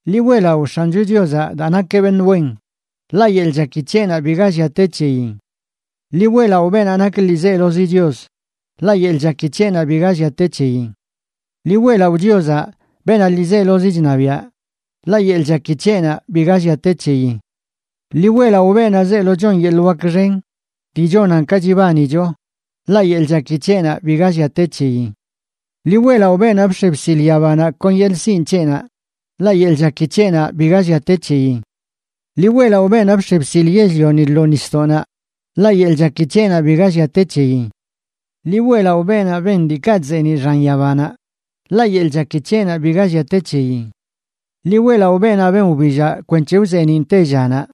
Ḻi weꞌlaꞌo X̱ancho Chiozaꞌ daa nakeꞌ beṉꞌ wen, ḻaꞌ yeḻꞌ chaki c̱heꞌnaꞌ biga llia te c̱heyin. Ḻi weꞌlaꞌo beenaꞌ nak ḻiizelozi Chios, ḻaꞌ yeḻꞌ chaki c̱heꞌnaꞌ biga llia te c̱heyin. Ḻi weꞌlaꞌo Chiozaꞌ, beenaꞌ ḻiizelozi chṉabiaꞌ, ḻaꞌ yeḻꞌ chaki c̱heꞌnaꞌ biga llia te c̱heyin. Ḻi weꞌlaꞌo beenaꞌ zeelo chon yeḻꞌ wak xen dii chonan ka chibanicho, ḻaꞌ yeḻꞌ chaki c̱heꞌnaꞌ biga llia te c̱heyin. Ḻi weꞌlaꞌo beenaꞌ bx̱e bsil yabanaꞌ kon yeḻꞌ sinꞌ c̱heꞌnaꞌ, ḻaꞌ yeḻꞌ chaki c̱heꞌnaꞌ biga llia te c̱heyin. Ḻi weꞌlaꞌo beenaꞌ bx̱e bsil yell-lioni lo nisdoꞌnaꞌ, ḻaꞌ yeḻꞌ chaki c̱heꞌnaꞌ biga llia te c̱heyin. Ḻi weꞌlaꞌo beenaꞌ ben diikaꞌ chzeeniꞌ xan yabanaꞌ, ḻaꞌ yeḻꞌ chaki c̱heꞌnaꞌ biga llia te c̱heyin. Ḻi weꞌlaꞌo beenaꞌ ben wbillaꞌ kwenc̱he wzeeniꞌn tellanaꞌ,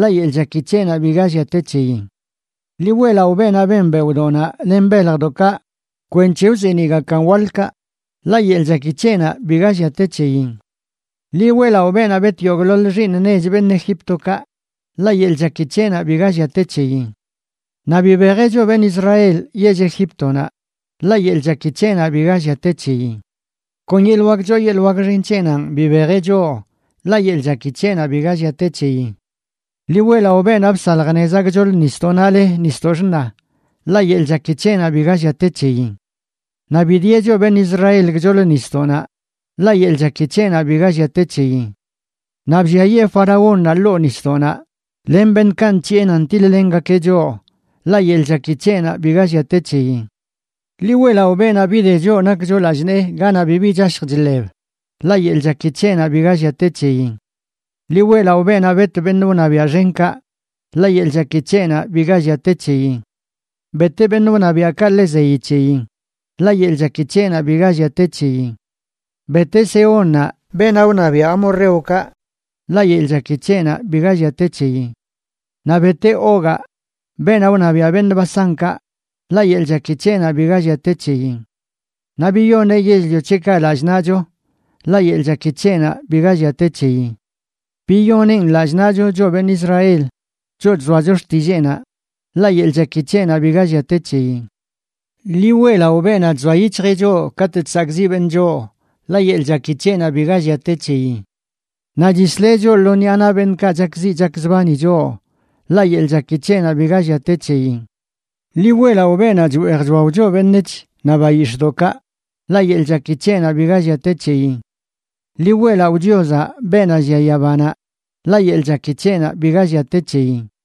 ḻaꞌ yeḻꞌ chaki c̱heꞌnaꞌ biga llia te c̱heyin. Ḻi weꞌlaꞌo beenaꞌ ben beoꞌdoꞌnaꞌ len beljdoꞌkaꞌ kwenc̱he wzeeniꞌgakan waḻkaꞌ, ḻaꞌ yeḻꞌ chaki c̱heꞌnaꞌ biga llia te c̱heyin. Ḻi weꞌlaꞌo beenaꞌ bet yogꞌḻoḻ xiiṉ nech beṉꞌ Egíptokaꞌ, ḻaꞌ yeḻꞌ chaki c̱heꞌnaꞌ biga llia te c̱heyin. Naꞌ bibejeꞌ choꞌ beṉꞌ Israel yell Egíptonaꞌ, ḻaꞌ yeḻꞌ chaki c̱heꞌnaꞌ biga llia te c̱heyin. Kon yeḻꞌ wak choo yeḻꞌ wak xen c̱heꞌnanꞌ bibejeꞌ choꞌ, ḻaꞌ yeḻꞌ chaki c̱heꞌnaꞌ biga llia te c̱heyin. Ḻi weꞌlaꞌo beenaꞌ bsalj nezaꞌ gchoḻ nisdoꞌnaꞌ le Nisdoꞌ Xṉa, ḻaꞌ yeḻꞌ chaki c̱heꞌnaꞌ biga llia te c̱heyin. Naꞌ bidieꞌ choꞌ beṉꞌ Israel gchoḻ nisdoꞌnaꞌ, ḻaꞌ yeḻꞌ chaki c̱heꞌnaꞌ biga llia te c̱heyin. Naꞌ blliayee faraónnaꞌ ḻoo nisdoꞌnaꞌ, len beṉꞌkaꞌ nc̱hiꞌe nan tiḻ-lengakeꞌ choꞌ, ḻaꞌ yeḻꞌ chaki c̱heꞌnaꞌ biga llia te c̱heyin. Ḻi weꞌlaꞌo beenaꞌ bide choꞌ nakcho lallꞌ nee ganaꞌ bibi chashj chḻeb, ḻaꞌ yeḻꞌ chaki c̱heꞌnaꞌ biga llia te c̱heyin. Ḻi weꞌlaꞌo beenaꞌ bet beṉꞌ wṉabiaꞌ xenkaꞌ, ḻaꞌ yeḻꞌ chaki c̱heꞌnaꞌ biga llia te c̱heyin. Beteꞌ beṉꞌ wṉabiaꞌkaꞌ ḻe zeyi c̱heyin, ḻaꞌ yeḻꞌ chaki c̱heꞌnaꞌ biga llia te c̱heyin. Beteꞌ Sehónnaꞌ, beenaꞌ wṉabiaꞌ amorreokaꞌ, ḻaꞌ yeḻꞌ chaki c̱heꞌnaꞌ biga llia te c̱heyin. Naꞌ beteꞌ Ogaꞌ, beenaꞌ wṉabiaꞌ beṉꞌ Basánkaꞌ, ḻaꞌ yeḻꞌ chaki c̱heꞌnaꞌ biga llia te c̱heyin. Naꞌ biyoneꞌ yell-lio c̱heꞌkaꞌ lallꞌ naꞌcho, ḻaꞌ yeḻꞌ chaki c̱heꞌnaꞌ biga llia te c̱heyin. Biyoneꞌn lallꞌ naꞌcho, choꞌ beṉꞌ Israel, choꞌ chzoacho xtilleenaꞌ, ḻaꞌ yeḻꞌ chaki c̱heꞌnaꞌ biga llia te c̱heyin. Ḻi weꞌlaꞌo beenaꞌ chzoa yic̱hjeꞌ choꞌ katꞌ chsakꞌziꞌ beṉꞌ choꞌ, ḻaꞌ yeḻꞌ chaki c̱heꞌnaꞌ biga llia te c̱heyin. Naꞌ chisleꞌ choꞌ lo ṉiꞌa naꞌ beṉꞌkaꞌ chakziꞌ chakzbani choꞌ, ḻaꞌ yeḻꞌ chaki c̱heꞌnaꞌ biga llia te c̱heyin. Ḻi weꞌlaꞌo beenaꞌ chweej chwao choꞌ beṉec̱h naꞌ bayix̱ꞌdoꞌkaꞌ, ḻaꞌ yeḻꞌ chaki c̱heꞌnaꞌ biga llia te c̱heyin. Ḻi weꞌlaꞌo Chiozaꞌ, beenaꞌ llia yabanaꞌ, ḻaꞌ yeḻꞌ chaki c̱heꞌnaꞌ biga llia te c̱heyin.